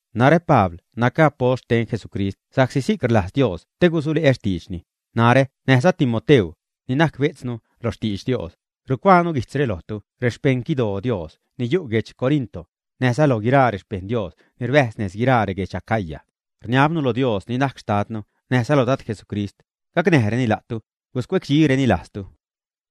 Narä Pabl nacä apost xten Jesucrist sa'csi si'c rlajz Dios te gusule'ä xtiidxni. Narä näjza Timoteu, ni najc bejtznu lo xtidx Dios, rucuaanu guijtzre lojtu rexpejṉ xquidoo Dios ni yu' guedx Corinto, näjza loj guiraa rexpejṉ Dios ni rbäjz nez guiraa reguedx Acaya. Rniabnu lo Dios ni najc Xtadnu näjza lo Dad Jesucrist, gacnäjreni la'tu, guscuecdxireni lajztu.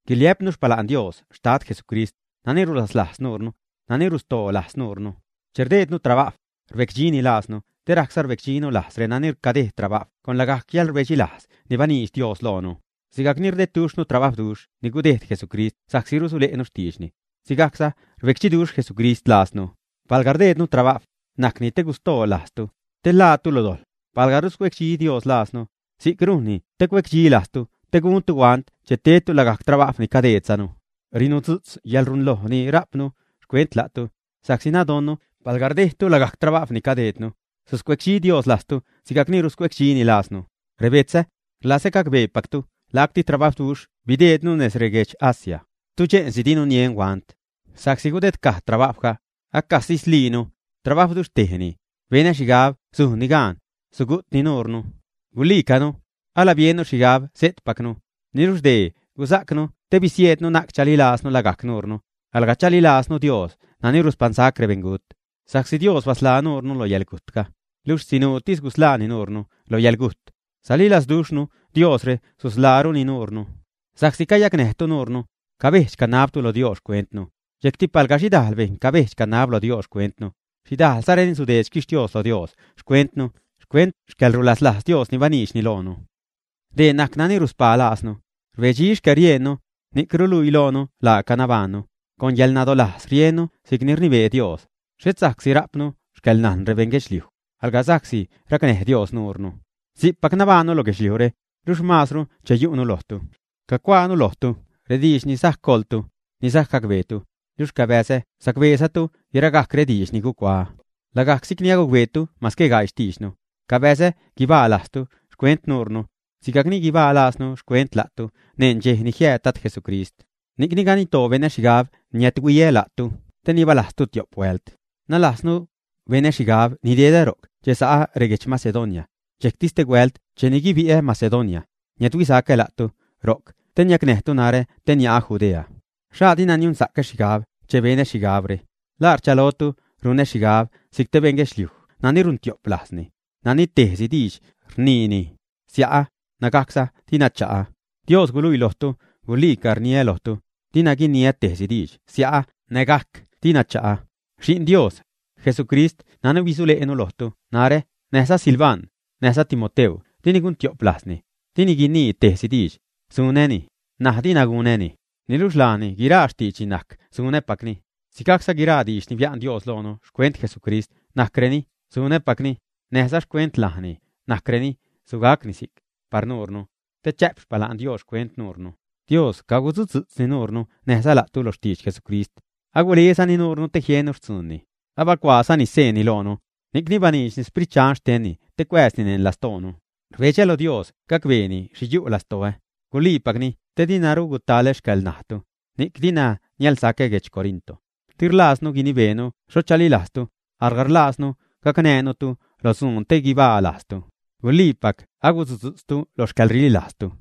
Guiliä'pnu xpala'n Dios Xtad Jesucrist, nani rulaslajz nuurnu, nani rustoolajz nuunu. Che rdejdnu trabajw, rbecdxini laaznu te rajcza rbecdxinu lajz renani cadejd trabajw con lagajc yäḻrbecdxilajz ni baniidx Dios loonu. Sigajc ni rdedduxhnu trabajwduxh ni gudejd Jesucrist sa'csi rusule'nu xtiidxni, sigajcza rbecdxiduxh Jesucrist laaznu. Palga rdeednu trabajw, najcni te gustolajz la'tu, te ḻaatu lo dojḻ. Palga ruscuecdxi Dios lajznu, si'c rujnni te cuedxilajztu te guntu huant che tedtu lagajc trabajw ni cadejdzanu. Rinudzu'tz yäḻrunloj ni rajpnu xcuent la'tu, sa'csi nadonnu palga rdejdtu lagajc trabajw ni cadejdnu, suscuecdxi Dios lajztu sigajcni ruscuedxini laaznu. Rebetzä, rlazä gacbeepactu lacti trabajwduxh bideednu nez reguedx Asia, tudxe'nsi dinu nien huant, sa'csi gudedcaj trabajwga, acasislinu. Trabawduxhtejni, benä xhigab sujnni gaan, sugu'tni nuurnu. Gulicanu, alabiennu xhigab sejtpacnu. Niluxh dee gusajcnu te bisieednu na'c chaliilajznu lagajc nuurnu, alga chaliilajznu Dios nani ruspaṉsac rebeṉgut. Sa'csi Dios basḻaa nuure lo yäḻgujtga, luxh sinuutis gusḻaani nuurnu lo yäḻgujt. Salilazduxhnu Diosre susḻaaruni nuurnu, sa'csi cayacnäjtu nuurnu, cabedx-canabtu lo Dios xcuentnu. Dxejcti palga xhidajl bejṉ cabedx-canab lo Dios xcuentnu, xhidajlzareni sudeed xquixtios lo Dios xcuentnu xcuent xcäḻrulaslajz Dios ni baniidxni loonu. Dee najc nani ruspaa laaznu: rbedxi xcäriejnnu, ni'c ruluii loonu laaca nabajṉnu, con yäḻnadolajz riennu si'cni rnibee Dios; xhet sa'csi rajpnu xcäḻnajn rebeṉ guedxliujdi, alga sa'csi racnäj Dios nuure. Si'cpac nabajṉnu lo guedxliujre, luxh maazru che yu'nu lojtu. Cacuaanu lojtu rediidx ni sajc goḻtu, ni sajc gacbeetu, luxh cabäzä sacbesa'ctu guiragajc rediidx ni gucuaä, lagajc si'cni agucbeetu mase gaii xtiidxnu, cabäzä guibaa lajztu xcuent nuurnu, sigajcni guibaa lajznu xcuent la'tu neṉ dxej ni jiääd Dad Jesucrist. Ni'cni ganiddoo benä xhigab niädhuiä la'tu te nibalajztu tio'p huält. Nalajznu, benä xhigab nidedä ro'c che sa'a reguedx Macedonia, dxejcti stehuält cheni guibi'ä Macedonia, niädhuisacä la'tu ro'c te niacnäjtu narä te nia'a Judea. ¿Xhaa dina niunsa'cä xhigab che benä xhigabre? ¿La rchalotu runä xhigabä si'c te beṉ guedxliuj nani runtiop lajzni, nani tejsi diidx rniini “sia'ä” nägajcza “dina cha'a”, ä? Dios guluii lojtu guliica rniä lojtu, dinu guinii tejsi diidx “sia'ä” nägajc “dina cha'a”. Xi'n Dios, Jesucrist nani bisule'nu lojtu narä näjza Silvan, näjza Timoteu dini guntio'p lajzni, dini guinii tejsi diidx “sunäni” näj “dina gunäni”, niluxh laani guiraa xtiidxni najc “sunäpacni”. Si'cza guiraa rediidx ni bia'n Dios loonu xcuent Jesucrist najcreni “sunäpacni”; näjza xcuent laani najcreni “sugacni si'c” par nuurnu, te chä'p xpala'n Dios xcuent nuurnu. Dios cagusudzu'tzza nuure näjza la'tu lo xtidx Jesucrist, agulezani nuurnu te jiennu xtzuunni. Abacuaazani xseenni loonu, ni'cni baniidxni Sprit Dxan xtenni te cuääzni neṉ lastoonu. Rbedxä loj Dios gacbeeni xhi yu' lastoä, guliipacni te diruna gutalä xcäḻnajtu, ni'c dina niälsacä guedx Corinto. Di rlajznu guinibeenu xho chalilajztu, alga rlajznu gacnäänutu lo dzuun te guibaa lajztu; guliipac agusudzu'tztu lo xcäḻrililajztu.